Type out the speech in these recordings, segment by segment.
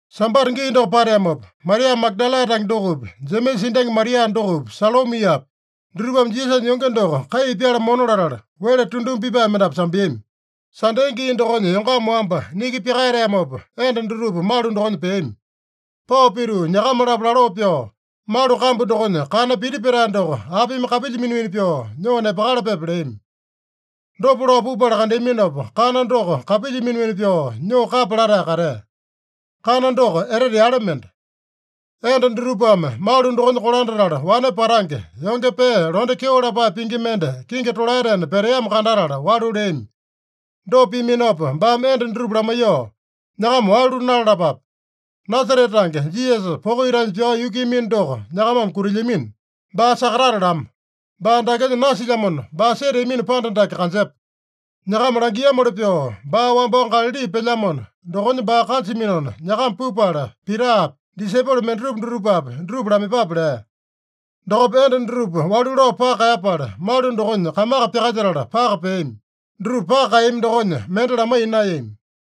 Sambata gii doko pateamopa, Maria Magadala tange dokopi, Jemesa endangi Maria dokopi, Salomiapi, dutupame Jisasanya yonge doko kai pyala mona latala, wele tunduma pipae mendapu sambeami. Sande gii dokonya yongama wamba, niki pyakaeteamopa, enda dutupa malu dokonya peami. Pao pituu nyakama-lapo laloo pyoo, “Malu kambu dokonya kana piti petae doko apimi kapilya mina-mina pyoo nyoo nepakalapepe?” leami. Dopa lao pupala kandeaminopa, kana doko kapilya mina-mina pyoo nyoo kapya latae katea. (Kana doko etete yale mende.) Enda dutupame malu dokonya kolandatala, wane patange, yonge pee londe kyeo lapae pingi mende kingi tolaetena peteamo kandatala, walu leami. Dopa piaminopa baame enda dutupa lamaiyoo, “Nyakama walu nalalapape. Nasarete tange Jisasa, poko itanya pyao yukuiyamino doko nyakamame kutilyamino. Baa sakatatalamo. Baa dakenya nasilyamona, baa seteamino panda dake kanjepa. Nyakama langiamoli pyoo baa wambao Galali pelyamona, dokonya baa kanjaminona, nyakama pupala, Pitapi, disaipolo mendatupa dutupapi, dutupa lamaiyepape” lea. Dokopa enda dutupa walu lao paka kaeyapala, malu dokonya kamaka pyakalyetala, paka peami. Dutupa paka kaeyami dokonya, mende lamaiya naeyami.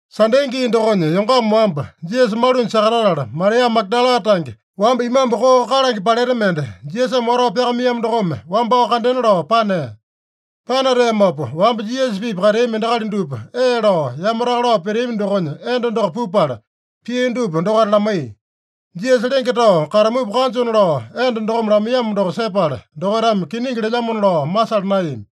Sande gii dokonya yongama wamba Jisasa malunya sakatatala, Maria Magadala tange, wamba imambu koo kalange paleta mende, Jisasame watao pyakamaiyamo dokome wambao kandena lao panea. Panateamopa wamba Jisasa-pipa kateami endakali dupa ee lao yamataka lao peteami dokonya enda doko pupala, pia dupa dokaita lamaiya. Jisasa lenge tao katamupa kanjona lao enda dokome lamaiyamo doko sepala, dokaitame kiningi lelyamona lao masala naeyami.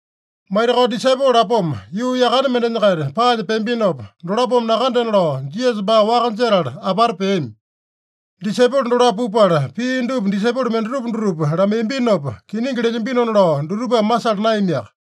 Maitakao disaipolo lapoma yuu yakane mendenya-kaita paanya peambinopa, dolapome nakandena lao Jisasa baa waka jetala apata peami. Disaipolo dolapo pupala, pia dupa disaipolo mendatupa dutupa lamaiyambinopa, kiningi lelyambinona lao dutupame masala naeyamiaka.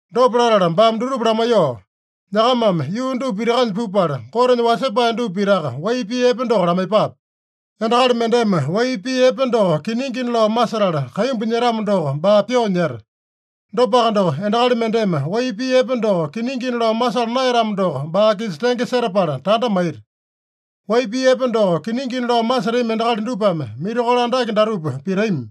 Dopa latala baame dutupa lamaiyoo, “Nyakamame yuu dupa pitakanya pupala, Gotenya wasepae dupa pitaka wai pii epe doko lamaiyepape. Endakali mendeme wai pii epe doko kiningina lao masetala kaimbu nyetamo doko, baa pyoo nyeta. Dopaka doko, endakali mendeme wai pii epe doko kiningina lao masala naeyatamo doko, baa-kisa tenge setapala tanda maita. Wai pii epe doko kiningina lao masetami endakali dupame mirakolo andake datupa pitami: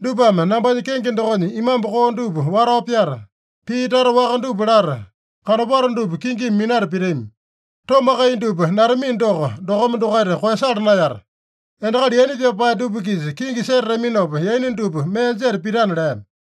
Dupame nambanya kenge dokonya imambu koo dupa watao pyata, pii tata waka dupa lata, kanopato dupa kingimi minata pitami. Tomakai dupa natamino doko, dokome dokaita koeyasala naeyata. Endakali yaina pyapae dupa-kisa kingi setataminopa, yaina dupa mee jeta pitana” lea.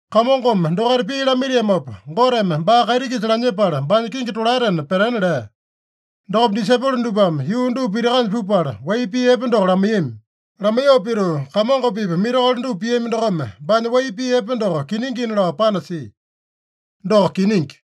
Kamongome dokaita pii lamaitiamopa, Goteme baa kaiti-kisa lanyepala, baanya kingi tolaetena petena lea. Dokopa disaipolo dupame yuu dupa pitakanya pupala, wai pii epe doko lamaiyami. Lamaiyoo pituu, Kamongo-pipa mirakolo dupa piami dokome, baanya wai pii epe doko kiningina lao panasia. Doko kiningi.